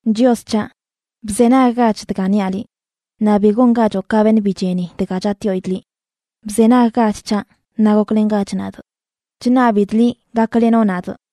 Chios c̱haꞌ, bzenaggach dga niaꞌ liꞌ, naꞌ bi gongachoꞌ ka beṉꞌ bi cheni dga chatꞌyoidꞌ liꞌ. Bzenaggach c̱haꞌ naꞌ goklengach nadꞌ. Chṉabidꞌ liꞌ gaklenoꞌ nadꞌ,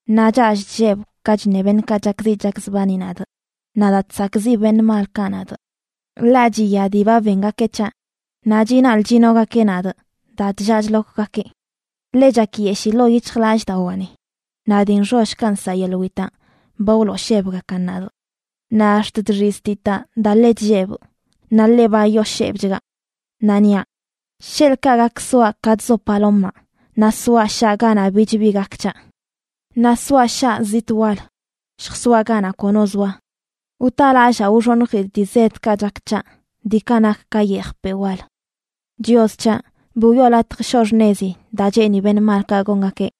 naꞌ chall chllebꞌ ka chṉe beṉꞌkaꞌ chakziꞌ chakzbani nadꞌ, naꞌ daa chsakꞌziꞌ beṉꞌ malkaꞌ nadꞌ. Ḻaꞌ chiya dii ba bengakeꞌ c̱haꞌ naꞌ chinaḻꞌ chinogakeꞌ nadꞌ daa chllaa chlokgakeꞌ. Ḻe chakyeshii ḻoo yic̱hjlallꞌdawaani naꞌ dii nxollkaꞌ nsaꞌ yeḻꞌ witaꞌ ba wlooshebgakan nadꞌ. Naꞌ ax̱t chxiztitaꞌ daa ḻe chllebꞌ, naꞌ ḻe ba yooshebchgaꞌ. Naꞌ niaꞌ: “Sheḻꞌkaꞌ gak soaꞌ ka chzo palomaꞌ, naꞌ soaꞌ shaa ganaꞌ bich bi gak c̱haꞌ. Naꞌ soaꞌ shaa zitꞌ wal; lljasoaꞌ ganaꞌ kono zoa. Wtalallaa wxoṉjidꞌ dii zedkaꞌ chak c̱haꞌ, diikaꞌ nak ka yejpeꞌ wal.” Chios c̱haꞌ, bi wiꞌo latj shoꞌ xṉezi daa cheeni beṉꞌ malkaꞌ gongakeꞌ.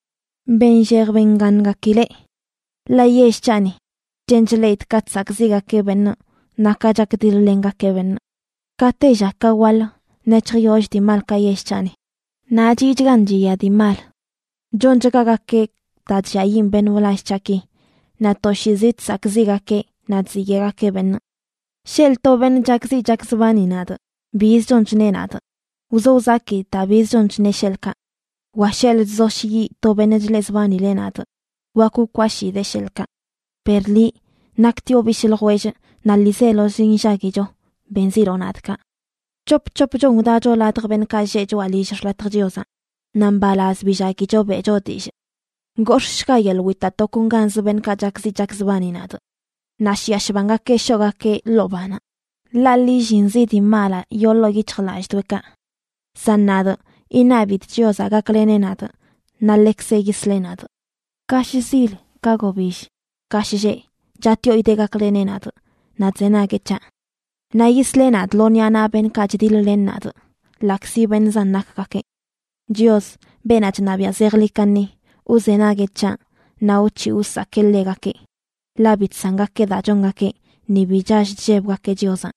Benllej bengaṉgakileꞌ. Ḻaꞌ yell c̱haꞌni, chen chleꞌidꞌ ka chsakꞌziꞌgakeꞌ beṉꞌ naꞌ ka chakdiḻ-lengakeꞌ beṉꞌ. Ka tella ka waḻ nec̱hjyoll dii malkaꞌ yell c̱haꞌni, naꞌ chiꞌchgan chiya dii mal. Chonchgagakeꞌ daa chlliayiꞌn beṉꞌ wlall c̱haꞌki, naꞌ toshiizi chsakꞌziꞌgakeꞌ naꞌ chziyeꞌgakeꞌ beṉꞌ. Sheḻꞌ to beṉꞌ chakziꞌ chakzbani nadꞌ biz chon chneꞌ nadꞌ, wzo wzakidꞌ daa biz chon chneꞌ, sheḻꞌkaꞌ. Wa sheḻꞌ chzoshyiꞌ to beṉꞌ chleꞌzbanileꞌ nadꞌ, wak wkwashidee, sheḻꞌkaꞌ. Per liꞌ, naktioꞌ bishꞌ ljwellꞌ naꞌ ḻiizelozi nllaguicho, benziloꞌ nadꞌ kaꞌ. C̱hop c̱hopchon wdacho ladj beṉꞌkaꞌ lleꞌ choꞌa lill x̱latjə Chiozaꞌ, naꞌ mbalaz billaguicho beꞌcho dillꞌ. ¡Gox̱ꞌshga yeḻꞌ witaꞌ tokonganzə beṉꞌkaꞌ chakziꞌ chakzbani nadꞌ! Naꞌ shiꞌa shbangakeꞌ shoꞌgakeꞌ ḻoo banaꞌ, ḻaꞌ lillinzi dii malaꞌ yoo ḻoo yic̱hjlallꞌdoꞌekaꞌ. San nadꞌ iṉabidꞌ Chiozaꞌ gakleneꞌ nadꞌ, naꞌ ḻekzeꞌ yisleꞌ nadꞌ. Ka shzil, ka gobill, ka shlleꞌ, chatꞌyoidee gakleneꞌ nadꞌ, naꞌ chzenagueꞌ c̱haꞌ. Naꞌ yisleꞌ nadꞌ lo ṉiꞌa naꞌ beṉꞌkaꞌ chdiḻ-len nadꞌ, ḻaꞌkzi beṉꞌ zan nakgakeꞌ. Chios, beenaꞌ chṉabiaꞌ zejḻi kaṉi, wzenagueꞌ c̱haꞌ naꞌ wc̱hiꞌ wsakee ḻegakeꞌ, ḻaꞌ bi chsangakeꞌ daa chongakeꞌ ni bi chall chllebgakeꞌ Chiozaꞌ.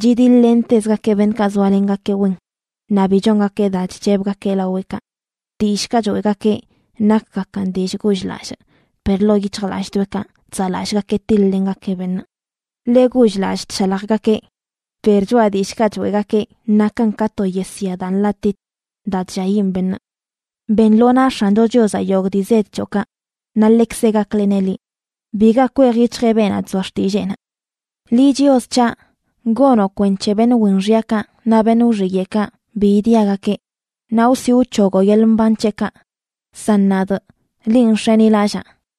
Chidiḻ-lentezgakeꞌ beṉꞌkaꞌ zoalengakeꞌ wen; naꞌ bi chongakeꞌ daa chc̱hebgakeꞌ laweꞌkaꞌ. Dillꞌkaꞌ choeꞌgakeꞌ nakgakan dillꞌ gull-lallꞌ, per ḻoo yic̱hjlallꞌdoꞌekaꞌ chzaꞌlallꞌgakeꞌ tiḻ-lengakeꞌ beṉꞌ. Ḻe gull-lallꞌ chshaljgakeꞌ, per choꞌa dillꞌkaꞌ choeꞌgakeꞌ nakan ka to yesya daa nḻatit, daa chlliayiꞌn beṉꞌ. Ben lo naꞌ X̱ancho Chiozaꞌ yogꞌ dii zed c̱hoꞌkaꞌ, naꞌ ḻekzeꞌ gakleneꞌ liꞌ. Biga kwej yic̱hjeꞌ beenaꞌ chzoa xtilleenaꞌ. Liꞌ, Chios c̱haꞌ, gonoꞌ kwenc̱he beṉꞌ wen xyakaꞌ naꞌ beṉꞌ wxiyeꞌkaꞌ bi idiagakeꞌ, naꞌ wsi wc̱hogoꞌ yeḻꞌ mban c̱heꞌkaꞌ. San nadꞌ, linꞌ nx̱enilallaa.